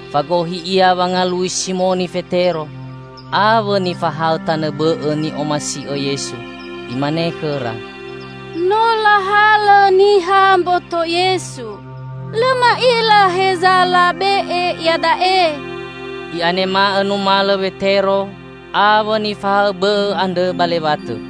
Fagohi ia wangalui Simoni Fetero awõ nifahaõ tanõ bõ'õ ni'omasi'õ Yesu, imane khõra, "No lahalõ niha mboto Yesu; lõ ma'ila heza labe'e iada'e!" I'anema'õ numalõ Wetero awõ nifahaõ bõ'õ andrõ ba lewatõ.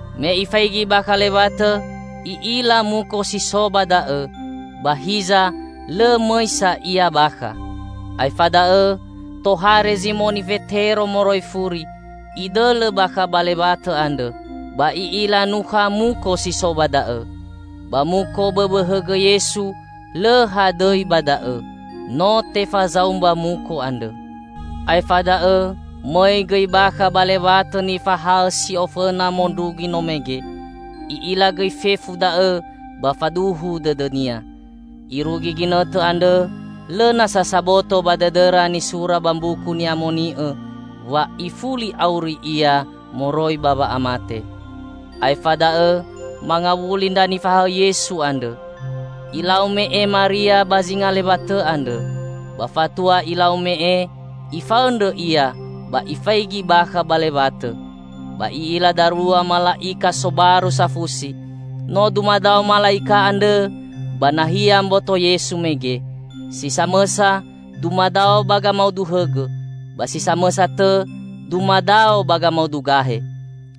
Me ifaigi bakha lewatõ, i'ila muko si so ba da'õ, ba hiza lõ mõi sa ia bakha. Aefa da'õ tohare Zimoni Fetero moroi furi, idõlõ bakha ba lewatõ andrõ. Ba i'ila nukha muko si so ba da'õ, ba muko bõbõ hõgõ Yesu lõ hadõi ba da'õ. No tefazaumba muko andrõ. Aefa da'õ mõi gõi bakha ba lewatõ nifahaõ si'ofõna mondrugi no mege. I'ila gõi fefu da'õ ba faduhu dõdõnia. (Irugi ginõtõ andrõ lõ nasa saboto ba dõdõra nisura ba Mbuku Ni'amoni'õ wa ifuli auri Ia moroi ba wa'amate.) Aefa da'õ mangawuli ndra nifahaõ Yesu andrõ. Ilau me'e Maria ba zinga lewatõ andrõ. Ba fatua ilau me'e, ifaõndrõ ia ba ifaigi bakha ba lewatõ, ba i'ila darua mala'ika sobaru safusi. No dumadao mala'ika andrõ ba nahia mboto Yesu mege. Si samõsa dumadao ba gamaudu hõgõ, ba si samõsa tõ dumadao ba gamaudu gahe.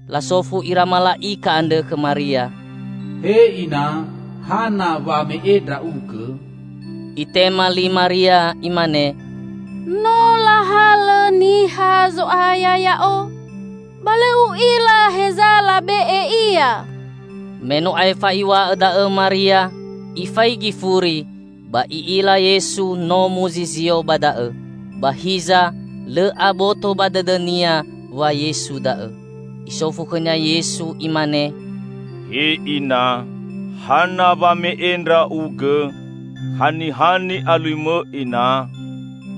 Lasofu ira mala'ika andrõ khõ Maria, "He Ina, hana wa me'e ndra'ugõ?" Itema li Maria imane, "No lahalõ niha Zo'aya ya'o, ba lõ u'ila heza labe'e Ia!" Me no aefa iw̃a'õ da'õ Maria ifaigi furi ba i'ila Yesu no muzizio ba da'õ. Ba hiza lõ aboto ba dõdõnia wa Yesu da'õ. Isofu khõnia Yesu Imane, "He Ina, hana wa me'e ndra'ugõ? Haniha ni'aluimõ Ina?"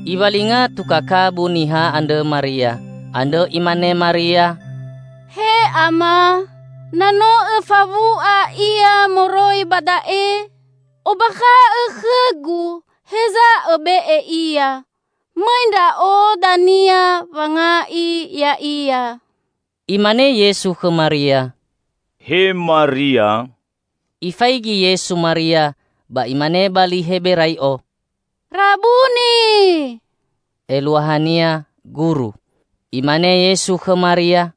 Iwalinga tuka kabu niha andrõ Maria. Andrõ imane Maria, "He Ama, na no õfawu'a Ia moroi ba da'e, ombakha'õ khõgu heza õbe'e Ia. Mõi ndra'o dania wanga'i Ya'ia." Imane Yesu khõ Maria, "He Maria!" Ifaigi Yesu Maria ba imane ba li Heberai'o, "Rabuni!" (Eluahania "Guru".) Imane Yesu khõ Maria,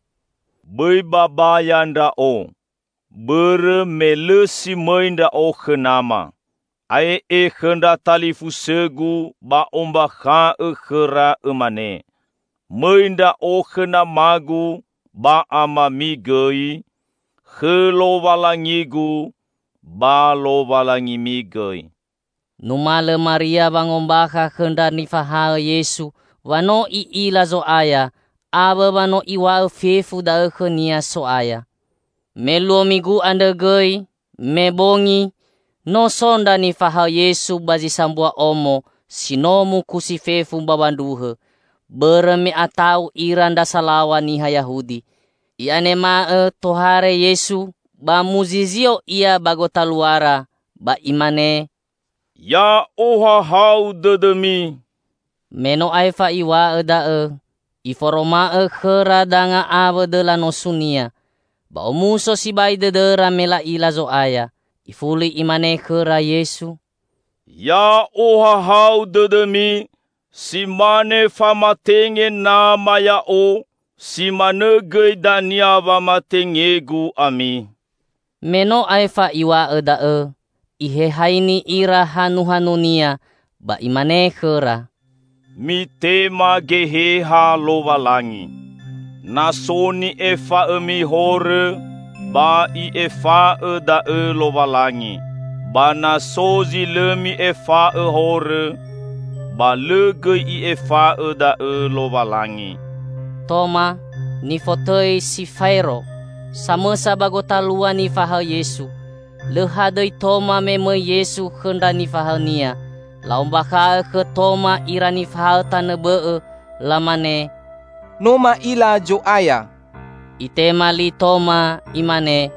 "Bõi babaya Ndra'o. Bõrõ me lõ si mõi Ndra'o khõ nama. Ae'e khõ ndra talifusõ-Gu ba ombakha'õ khõra, õmane. Mõi Ndra'o khõ Nama-Gu ba amami gõi; khõ Lowalangi-Gu ba Lowalangimi gõi." Numalõ Maria wangombakha khõ ndra nifahaõ Yesu wa no i'ila Zo'aya awõ wa no Iw̃a'õ fefu da'õ khõnia So'aya. Me luo Migu andrõ gõi, me bongi, no so ndra nifahaõ Yesu ba zi sambua omo si no mukusi fefu mbawa ndruhõ; bõrõ me ata'u ira ndra salaw̃a niha Yahudi. I'anema'õ tohare Yesu ba muzizio Ia ba gotaluara, ba Imane, "Ya'ohahau dõdõmi!" Me no aefa Iw̃a'õ da'õ, Iforoma'õ khõra danga awõ dõla nosu-Nia. Ba omuso sibai dõdõra me la'ila Zo'aya. Ifuli Imane khõra Yesu, "Ya'ohahau dõdõmi! Si mane famatenge Nama Ya'o, si manõ gõi dania wamatenge-Gu ami." Me no aefa Iw̃a'õ da'õ Ihehaini ira hanuhanu-Nia ba Imane khõra, "Mitema Geheha Lowalangi. Na so ni'efa'õmi horõ, ba I'efa'õ da'õ Lowalangi. Ba na so zi lõ mi'efa'õ horõ, ba lõ gõi I'efa'õ da'õ Lowalangi." Toma (nifotõi si "Faero") samõsa ba gotalua nifahaõ Yesu. Lõ hadõi Toma me mõi Yesu khõ ndra nifahaõ-Nia. La'ombakha'õ khõ Toma ira nifahaõ tanõ bõ'õ lamane, "No ma'ila Zo'aya!" Itema li Toma imane,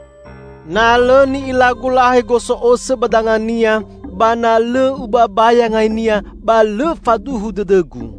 "Na lõ ni'ilagu lahe gosõ'osõ ba danga-Nia ba na lõ ubabaya ngai-Nia, ba lõ faduhu dõdõgu."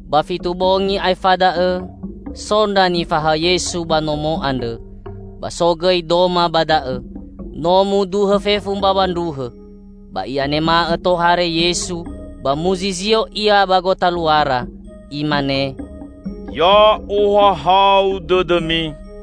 Ba fitu bongi aefa da'õ, so ndra nifahaõ Yesu ba nomo andrõ, ba so gõi Doma ba da'õ. No muduhõ fefu mbawa ndruhõ. Ba i'anema'õ tohare Yesu ba muzizio Ia ba gotaluara, Imane, "Ya'ohahau dõdõmi!"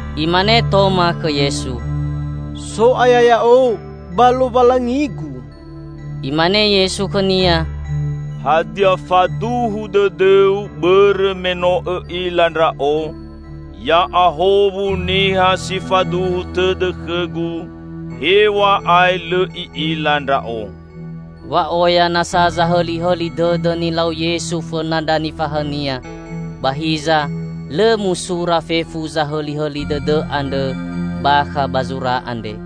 Imane Toma khõ Yesu, "So'aya ya'o! Ba Lowalangigu!" Imane Yesu khõnia, "Hadia faduhu dõdõu bõrõ me no õ'ila Ndra'o? Ya'ahowu niha si faduhu tõdõ khõ-Gu, hew̃a'ae lõ i'ila Ndra'o!" Wa oya nasa zahõlihõli dõdõ nilau Yesu fõna ndra nifahaõ-Nia, ba hiza lõ musura fefu zahõlihõli dõdõ andrõ bakha ba zura andre.